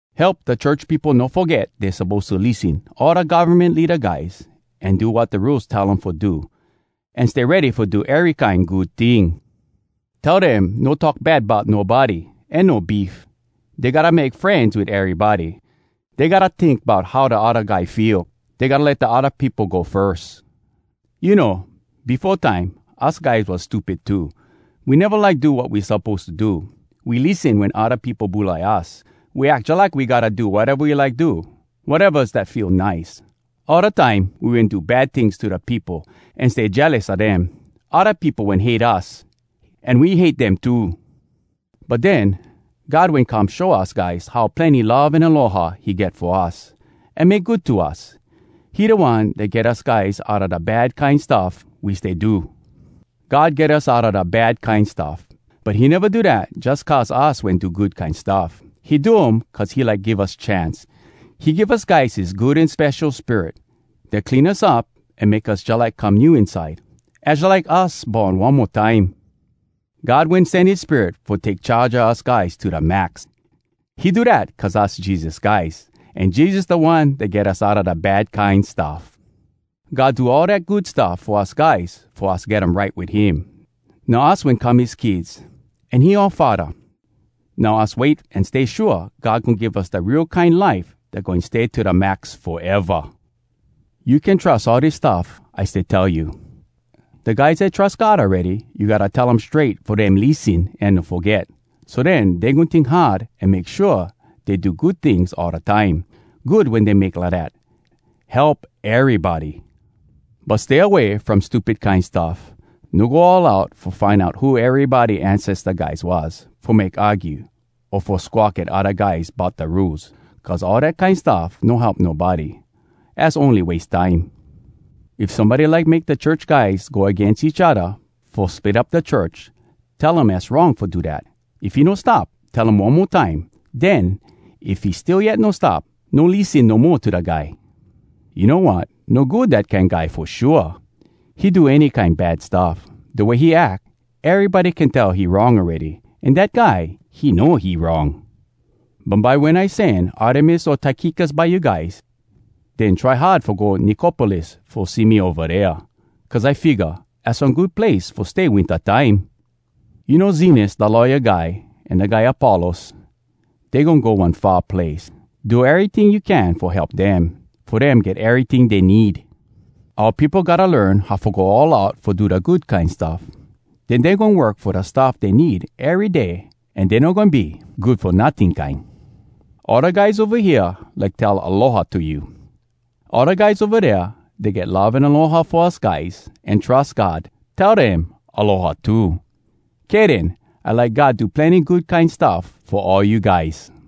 Help da church peopo no foget dey suppose to lissen all da govmen leada guys, an do wat da rules tell um fo do, an stay ready fo do ery kine good ting. Tell dem no talk bad bout nobody, an no beef. Dey gotta make frenz wit erybody. Dey gotta tink bout how da odda guy feel. Dey gotta let da odda peopo go firs. You know, befo time us guys was stupid too. We neva like do wat we suppose to do. We lissen wen odda peopo bulai us. We ack jalike we gotta do wateva we like do, watevas dat feel nice. All da time, we wen do bad tings to da peopo, an stay jealous a dem. Odda peopo wen hate us, an we hate dem too. But den, God wen come show us guys how plenny love an aloha he get fo us, an make good to us. He da One dat get us guys outa da bad kine stuff we stay do. God get us outa da bad kine stuff, but he neva do dat jus cuz us wen do good kine stuff. He do um cuz he like give us chance. He give us guys his Good An Spesho Spirit, dat clean us up an make us jalike come new inside. Az jalike us born one mo time. God wen sen his Spirit fo take charge a us guys to da max. He do dat cuz us Jesus guys, an Jesus da One dat get us outa da bad kine stuff. God do all dat good stuff fo us guys fo us get um right wit him. Now us wen come his kids, an he oua Faddah. Now us wait an stay shua God goin give us da real kine life dat goin stay to da max foeva! You can trus all dis stuff I stay tell you. Da guys dat trus God awready, you gotta tell um strait fo dem lissen an no foget. So den, dey goin tink hard an make shua dey do good tings all da time. Good wen dey make lidat—help erybody. But stay away from stupid kine stuff. No go all out fo find out who erybody ancesta guys was, fo make argue, o fo squawk at odda guys bout da Rules. Cuz all dat kine stuff no help nobody. Az ony wase time. If somebody like make da church guys go agains each odda fo split up da church, tell him az wrong fo do dat. If he no stop, tell him one mo time. Den, if he still yet no stop, no lissen no mo to da guy. You know wat? No good, dat kine guy, fo shua. He do any kine bad stuff. Da way he ack, erybody can tell he wrong awready. An dat guy, he know he wrong! Bumbye wen I sen Artemas o Tykikus by you guys, den try hard fo go Nicopolis fo see me ova dea. Cuz I figga, az one good place fo stay winta time. You know Zenas da lawya guy an da guy Apollos? Dey goin go one far place. Do eryting you can fo help dem, fo dem get eryting dey need. Oua peopo gotta learn how fo go all out fo do da good kine stuff. Den dey goin work fo da stuff dey need ery day an dey no goin be good fo notting kine. All da guys ova hea like tell “Aloha!” to you. All da guys ova dea dat get love an aloha fo us guys, an trus God, tell dem “Aloha!” too. Kay den. I like God do plenny good kine stuff fo all you guys!